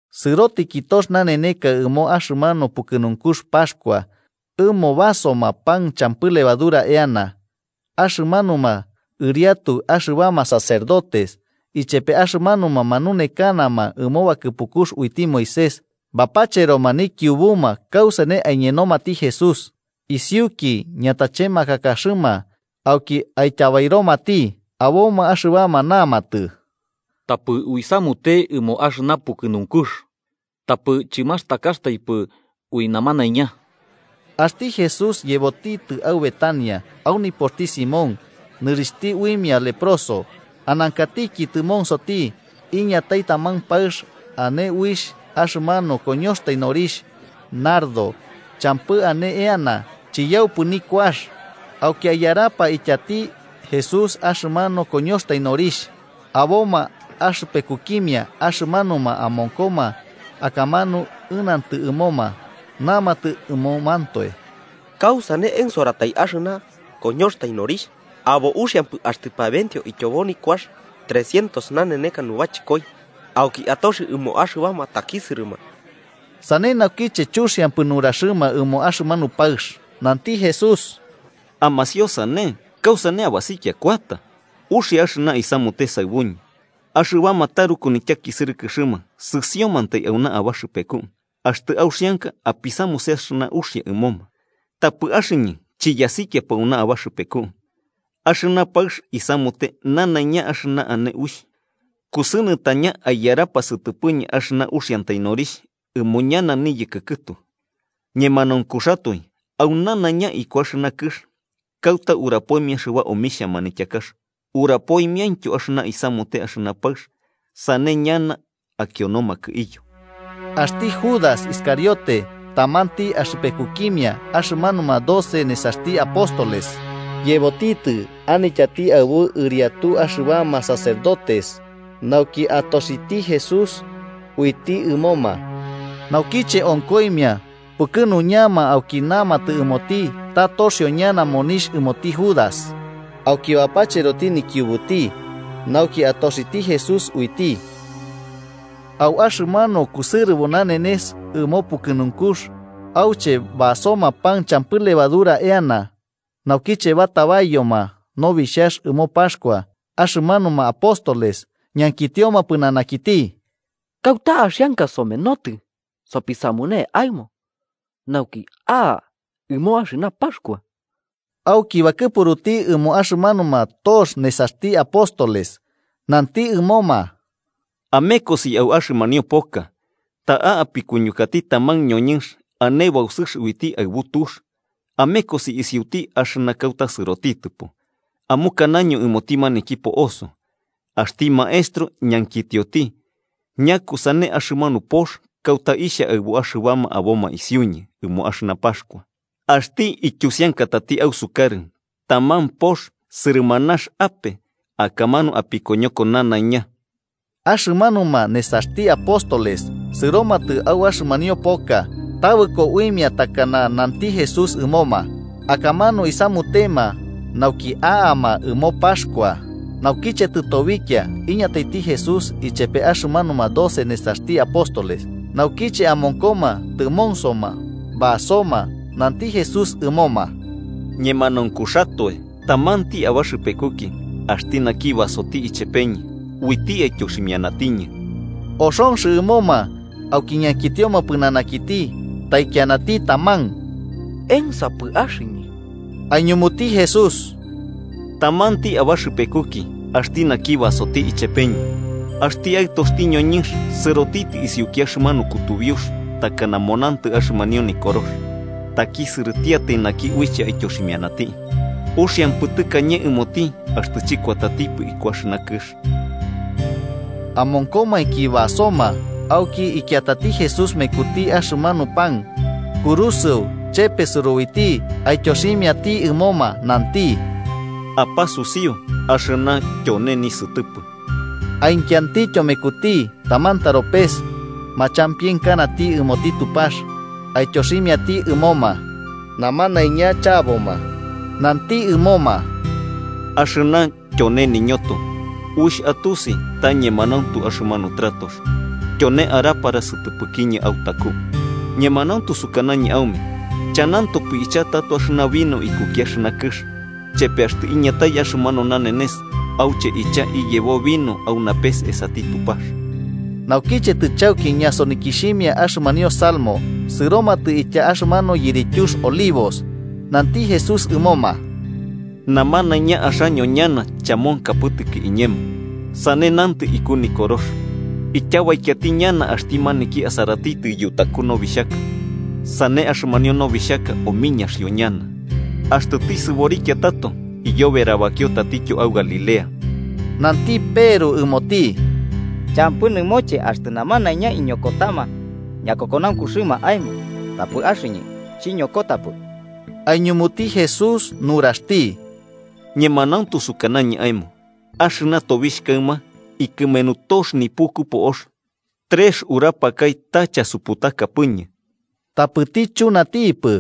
Sɨrotiki tox naneneka ɨmo axɨmanu pukɨnunkux Paxkua, ɨmo basoma pan champɨ levadura eana. Axɨmanuma ɨriatu axɨbama sacerdotes ichepe axɨmanuma manunekanama ɨmo bakɨpukux uiti Moisés bapacheroma nikiubuma kausane aiñenomati Jesús isiuki ñatachemakakaxɨma, nauki aityabairomati. Aboma axɨbama namatɨ: –Tapɨ uisamute ɨmo axɨna pukɨnunkux, tapɨ chɨmastakaxtaipɨ ui namanaiña. Axti Jesús yebotitɨ au Betania, au nipoxti Simón, nɨrixhti uimia leproso. Anankatiki tɨmonsoti, iñatai taman paɨx ane uixh axɨmanu koñoxtai norixh nardo champɨ ane eana, chiyaupɨ nikuax. Auki aiyarapa ityati Jesús axɨmanu koñoxtai norixh. Aboma axɨpekukimia axɨmanuma amonkoma akamanu ɨnantɨ ɨmoma, namatɨ ɨmomantoe: –¿Kausane ensoratai axɨna koñoxtai norixh? Abo uxiampɨ axtɨ pabenteo ityobo nikuax trecientos naneneka nubachɨkoi auki atoxi ɨmo axɨbama takisɨrɨma. Sane naukiche chuxiampɨ nuraxɨma ɨmo axɨmanu paɨx. Nanti Jesús: –Amasiosane. ¿Kausane abasikia kuata? Uxia axɨna isamute saɨbuñɨ. Axɨbama taruku nityakisɨrɨkɨxɨma sɨsiomantai auna abaxɨpeku, axtɨ auxianka apisamuse axɨna uxia ɨmoma. Tapɨ axɨñɨ chiyasikiapɨ auna abaxɨpeku. Axɨna paɨx isamute nanaiña axɨna ane uixh: kusɨnɨtaña aiyarapa sɨtɨpɨñɨ axɨna uxiantai norixh ɨmo ñana niyɨkɨ kɨtu. Ñemanaunkuxatoe au nanaiña iku axɨna kɨx kauta urapoimia axɨba omixhia manityakax, urapoimiaintyo axɨna isamute axɨna paɨx, sane ñana akionomakɨ iyo. Axti Judas Iscariote, tamanti axɨpekukimia axɨmanuma doce nesaxti apóstoles, yebotitɨ anityati aɨbu ɨriatu axɨbama sacerdotes nauki atoxiti Jesús uiti ɨmoma. Naukiche onkoimia, pukɨnuñama auki namatɨ ɨmoti ta toxio ñana monixh ɨmoti Judas, auki bapacheroti nikiubuti, nauki atoxiti Jesús uiti. Au axɨmanu kusɨrɨbo nanenes ɨmo pukɨnunkux auche basoma pan champɨ levadura eana, naukiche batabaiyoma nobixhax ɨmo Paxkua, axɨmanuma apóstoles ñankitioma pɨnanakiti: –¿Kauta axianka somenotɨ sopisamune aemo nauki a'a ɨmo axɨna Paxkua? Auki bakɨpuruti ɨmo axɨmanuma tox nesaxti apóstoles, nanti ɨmoma: –Amekosi au axɨmanio poka. Ta'a apikuñukati taman ñoñɨnx ane bausɨx uiti aɨbu tux. Amekosi isiuti, axɨna kauta sɨrotitɨpo, amukanaño ɨmoti maniki po'oso: ‘Axti maestro ñankitioti: ¿Ñakusane axɨmanu pox kauta ixha aɨbu axɨbama aboma isiuñɨ ɨmo axɨna Paxkua?’ Axti ityusiankatati ausukarɨ taman pox sɨrɨmanax ape, akamanu apikoñoko nanaiña. Axɨmanuma nesaxti apóstoles sɨromatɨ au axɨmanio poka. Tabɨko uimia takana nanti Jesús ɨmoma, akamanu isamutema nauki a'ama ɨmo Paxkua. Naukiche tɨtobikia, iñataiti Jesús ichepe axɨmanuma doce nesaxti apóstoles. Naukiche amonkoma tɨmonsoma basoma, nanti Jesús ɨmoma: –Ñemanaunkuxatoe tamanti abaxɨpekuki, axti naki basoti ichepeñɨ, uiti aityoximianatiñɨ. Oxonx ɨmoma, auki ñankitioma pɨnanakiti taikianati taman: –¿Ensapɨ axɨñɨ? Aiñumuti Jesús: –Tamanti abaxɨpekuki, axti naki basoti ichepeñɨ. Axti Aɨtoxti ñoñɨnx sɨrotitɨ isiuki axɨmanu kutubiux takana monantɨ axɨmanio Nikorox. ¡Takisɨrɨtiatai naki uiche aityoximianati! Uxiampɨ tɨkañe ɨmoti axtɨ chɨkuatatipɨ iku axɨna kɨx. Amonkomainki basoma, auki ikiatati Jesús mekuti axɨmanu pan, kurusɨo, chepesɨro uiti aityoximiati ɨmoma, nanti: –Apasusiu, axɨna tyone nisɨtɨpɨ. Aikiantityo mekuti taman taropes, machampienkanati ɨmoti Tupax, aityoximiati ɨmoma, namanaiña chaboma. Nanti ɨmoma: –Axɨna tyone niñoto, uixh atusi ta ñemanauntu axɨmanu tratox, tyone arapara sɨtɨpɨkiñɨ autaku. Ñemanauntu sukanañɨ aume chanantopɨ icha tato axɨna vino ikuki axɨna kɨx, chepe axtɨ iñatai axɨmanu nanenes auche ichaka iyebo vino au napes esati Tupax. Naukiche tɨchauki ñasonikixhimia axɨmanio salmos, sɨromatɨ itya axɨmanu yirityux Olivos. Nanti Jesús ɨmoma: –Namanaiña axaño ñana chamonkapɨtɨki iñemo. Sane nantɨ iku Nikorox: ‘Ityabaikiati ñana axti maniki asaratitɨ yutaku nobixhaka sane axɨmanio nobixhaka omiñaxio ñana.’ Axtɨ tisɨborikia tato, iyoberabakio tatityo au Galilea. Nanti Peru ɨmoti: –Champɨ nɨmoche axtɨ namanaiña iñokotama ñakokonaunkuxɨma aemo, tapɨ axɨñɨ chiñokotapɨ. Aiñumuti Jesús nuraxti: –Ñemanauntu sukanañɨ aemo axɨna tobixh kaɨma, ikɨmenu tox nipuku po'ox trex nurapakai ta chasuputakapɨñɨ. Tapɨti chunatipɨ: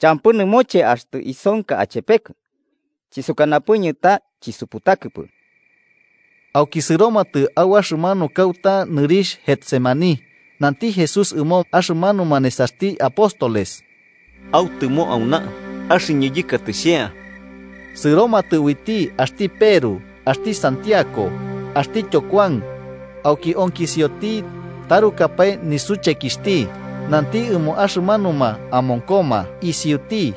–Champɨ nɨmoche axtɨ isonka achepekɨ, chisukanapɨñɨ ta chisuputakɨpɨ. Auki sɨromatɨ au axɨmanu kauta nɨrixh Getsemaní. Nanti Jesús ɨmo axɨmanuma nesaxti apóstoles: –Autɨmo auna, axɨñɨ yɨkatɨ xhea. Sɨromatɨ uiti axti Peru, axti Santiago axtityo Kuan, auki onkisioti tarukapae nisuchekixhti. Nanti ɨmo axɨmanuma amonkoma isiuti: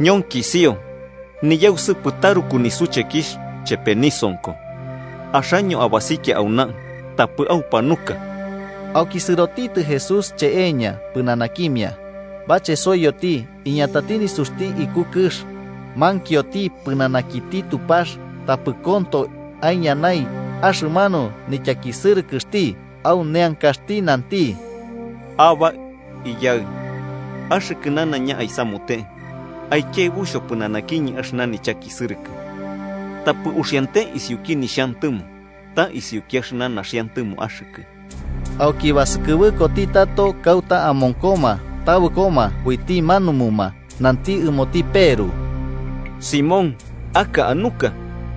–Ñonkisio niyausɨpɨ taruku nisuchekixh chepe nisonko. Axaño abasikia auna, tapɨ aupanuka. Auki sɨrotitɨ Jesús icheeña pɨnanakimia, bachesoiyoti iñatai nisuxti iku kɨx, mankioti pɨnanakiti Tupax tapɨ konto aiñanai axɨmanu nityakisɨrɨkɨxti. Au neankaxti nanti: “Abbá, Iyaɨ, axɨkɨ nanaiña aisamute: aikiaɨbu xhopɨnanakiñɨ axɨna nichakisɨrɨkɨ. Tapɨ uxiante isiuki nixhantɨmo ta isiuki axɨna naxiantɨmo axɨkɨ.” Auki basɨkɨbɨkoti tato kauta amonkoma, tabɨkoma uiti manumuma. Nanti ɨmoti Peru: –Simón, ¿aka anuka?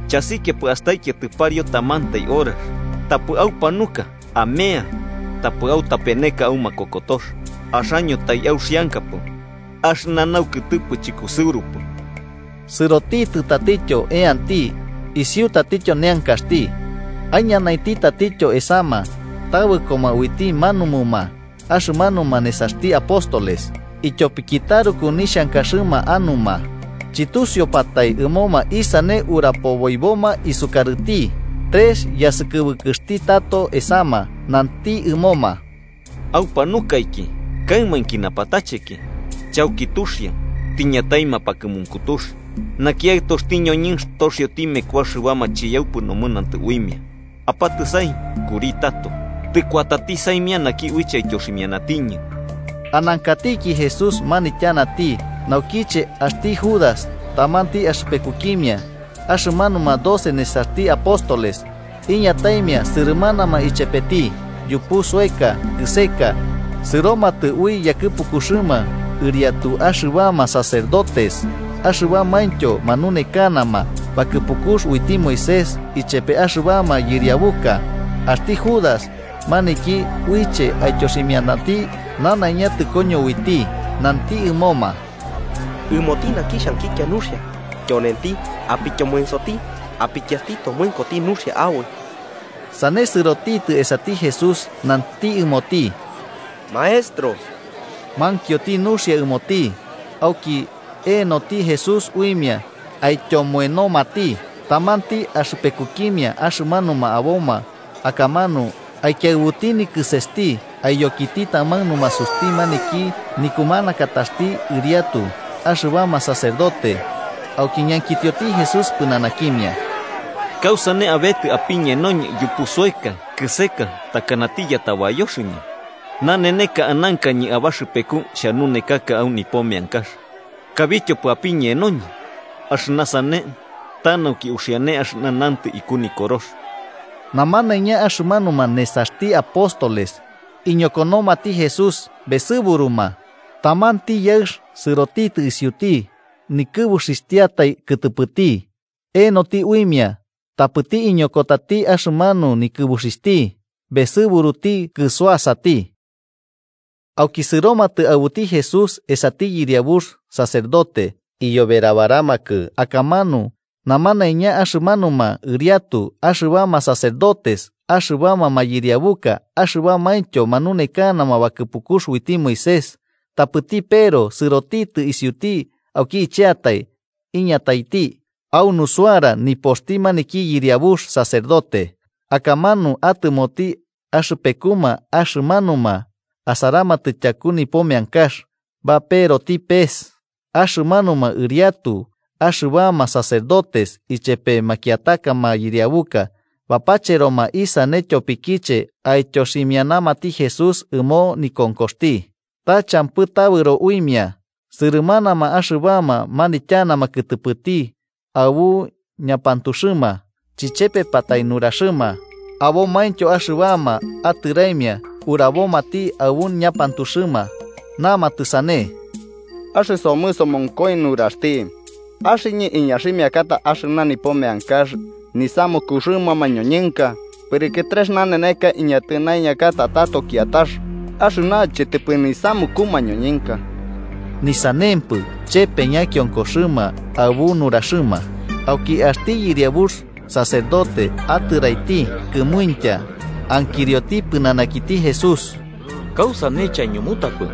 ¿Chasikiapɨ astaikiatɨ pariu tamantai horax? Tapɨ aumpanuka amea, tapɨ autapeneka au makokotox. Axaño taiauxiankapɨ, axɨna naukɨtɨpɨ chɨkusɨurupɨ. Sɨrotitɨ tatityo, eanti isiu tatityo neankaxti. Aiñanainti tatityo esama, tabɨkoma uiti manumuma axɨmanuma nesaxti apóstoles, ityopiki taruku nixhankaxɨma anuma. Chɨtusiupatai ɨmoma isane urapoboiboma isukarɨti. Trex yasɨkɨbɨkɨxti tato esama, nanti ɨmoma: –¿Aupanukaiki kaɨminki napatacheki? Chauki tuxia, tiñatai mapakɨmunkutux, naki Aɨtoxti ñoñɨnx toxioti meku axɨbama chiyaupɨ nomɨnantɨ uimia. Apatɨsai, kuri tato. Tɨkuatati saimia naki uiche aityoximianatiñɨ. Anankatiki Jesús manityanati naukiche axti Judas, tamanti axɨpekukimia axɨmanuma doce nesaxti apóstoles, iñataimia sɨrɨmanama ichepeti yupu soeka kɨseka. Sɨromatɨ ui yakɨpukuxɨma ɨriatu axɨbama sacerdotes, axɨmanumaintyo manunekanama bakɨpukux uiti Moisés ichepe axɨbama yɨriabuka. Axti Judas, maniki uiche aityoximianati, nanaiña tɨkoño uiti, nanti ɨmoma: “Ɨmoti naki xhankikia nuxia, tyonenti. Apiñensoti apikiasti tomoenoti nuxia aboi.” Sane sɨrotitɨ esati Jesús nanti ɨmoti: –¡Maestro! Mankioti nuxia ɨmoti. Auki enoti Jesús uimia aityomoenomati. Tamanti axɨpekukimia axɨmanuma aboma akamanu aikiaɨbuti nikɨsesti aiyokiti taman numasuxti maniki nikumanakataxti ɨriatu axɨbama sacerdote. Auki ñankitioti Jesús pɨnanakimia: –¿Kausane abetɨ apiñenoñɨ yupu soeka kɨseka, takanati yatabayoxɨñɨ? Naneneka anankañɨ abaxɨpeku xhanunekaka au nipo meankax, kabityopɨ apiñenoñɨ. Axɨna sane ta nauki uxiane axɨna nantɨ iku Nikorox. Namanaiña axɨmanuma nesaxti apóstoles iñokonomati Jesús, besɨburuma. Tamanti yaɨx sɨrotitɨ isiuti, nikɨbuxixhtiatai kɨtɨpɨti. Enoti uimia, tapɨti iñokotati axɨmanu nikɨbuxixhti besɨburuti kɨsuasati. Auki sɨromatɨ aɨbuti Jesús esati yɨriabux sacerdote, iyoberabaramakɨ akamanu namanaiña axɨmanuma ɨriatu axɨbama sacerdotes, axɨbama mayɨriabuka axɨbamaintyo manunekanama bakɨpukux uiti Moisés. Tapɨti Peru sɨrotitɨ isiuti auki icheatai iñataiti au nusuara nipoxti maniki yɨriabux sacerdote, akamanu atɨmoti axɨpekuma axɨmanuma asaramatɨ tyaku nipo meankax, baperoti pes. Axɨmanuma ɨriatu axɨbama sacerdotes ichepe makiataka mayɨriabuka bapacheroma isane ityopikiche aityoximianamati Jesús ɨmo nikonkoxti. Ta champɨ tabɨro uimia. Sɨrɨmanama axɨbama manityanama kɨtɨpɨti aɨbu ñapantuxɨma, chichepepatai nuraxɨma. Abomaintyo axɨbama atɨraimia urabomati aɨbu ñapantuxɨma, namatɨ sane: 58–Axɨsomɨ somonkoi nuraxti: ‘Axɨñɨ iñaximiakata axɨna nipo meankax nisamukuxɨma mañoñɨnka, pɨrɨkɨ trex naneneka iñatɨnaiñakata tato kiatax axɨna chɨtɨpɨ nisamuku mañonɨnka.’ Ni sanempɨ chepe ñakionkoxɨma aɨbu nuraxɨma. Auki axti yɨriabux sacerdote atɨraiti kɨmuintya, ankirioti pɨnanakiti Jesús: –¿Kausane chaiñumutapɨ?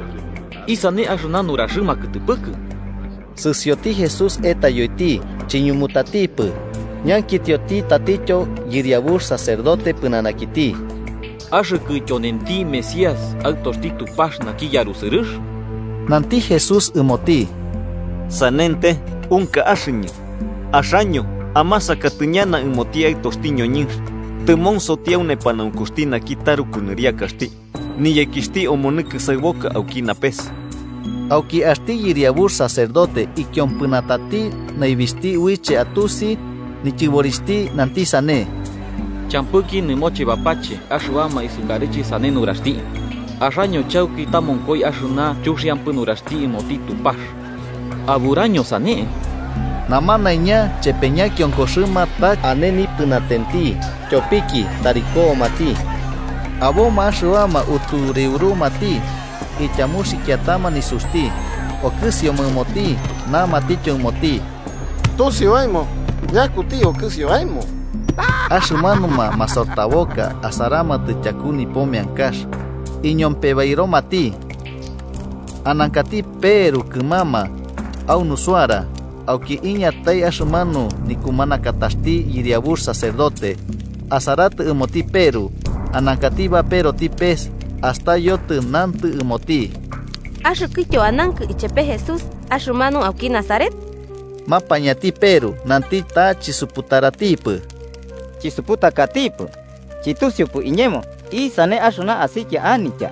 ¿Isane axɨna nuraxɨma akɨtɨpɨkɨ? Sɨsioti Jesús etayoiti, chiñumutatipɨ. Ñankitioti tatityo yɨriabux sacerdote pɨnanakiti: –¿Axɨkɨ tyonenti Mesías Aɨtoxti Tupax naki yarusɨrɨx? Nanti Jesús ɨmoti: –Sanente, unka axɨñɨ. Axaño amasakati ñana ɨmoti Aɨtoxti ñoñɨnx tɨmonsoti au nepanaunkuxti naki taruku Nɨriakaxti, niyekixhti omonɨ kɨsaɨboka auki napes. Auki axti yɨriabux sacerdote ikiompɨnatati naibixhti uiche atusi nityɨborixhti, nanti sane: –¿Champɨki nɨmoche bapache axɨbama isukarɨche sane nuraxti? Axaño chauki tamonkoi axɨna chuxiampɨ nuraxti ɨmoti Tupax. ¿Aburaño sane? Namanaiña chepe ñakionkoxɨma ta ane nipɨnatenti tyopiki tari komati. Aboma axɨbama utureurumati, ityamuxikiatama nisuxti okɨsioma ɨmoti, namatityo ɨmoti: –¡Tusiu aemo ñakuti okɨsio aemo! Axɨmanuma masortaboka asaramatɨ tyaku nipo meankax iñompebairomati. Anankati Peru kɨmama, au nusuara. Auki iñatai axɨmanu nikumanakataxti yɨriabux sacerdote. Asaratɨ ɨmoti Peru, anankati baperoti pes, astayotɨ nantɨ ɨmoti: –Axɨkɨtyo anankɨ ichepe Jesús, axɨmanu auki Nazaret. Mapañati Peru nanti, ta chisuputaratipɨ: –Chisuputakatipɨ, chɨtusiupɨ iñemo isane axɨna asikia anitya.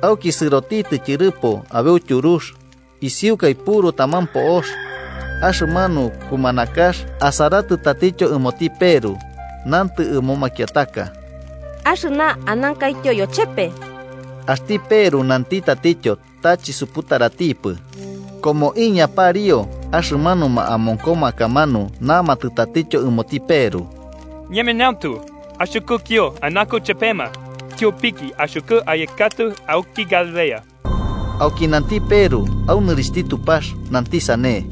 Auki sɨrotitɨ tyɨrɨpo, abeu tyurux. Isiukai puru taman po'ox. Axɨmanu kumanakax asaratɨ tatityo ɨmoti Peru nantɨ ɨmo makiataka: –Axɨna anankaityo yochepe. Axti Peru nanti tatityo ta chisuputaratipɨ. Komoiña pariu, axɨmanuma amonkoma akamanu namatɨ tatityo ɨmoti Peru: –Ñemanauntu, axɨkɨtyo anankɨ chepema, tyopiki axɨkɨ ayekatɨ auki Galilea. Auki nanti Peru au nɨrixhti Tupax, nanti sane: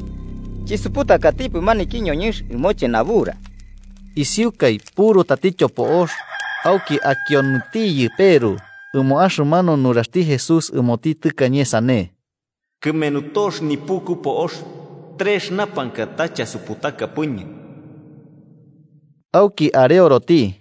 –¡Chisuputakatipɨ maniki ñoñɨnx ɨmoche nabura! Isiukai puru tatityo po'ox, auki akionotiyɨ Peru ɨmo axɨmanu nuraxti Jesús ɨmoti tɨkañe sane: ‘Kɨmenu tox nipuku po'ox, trex urapakai ta chasuputakapɨñɨ.’ Auki areoroti.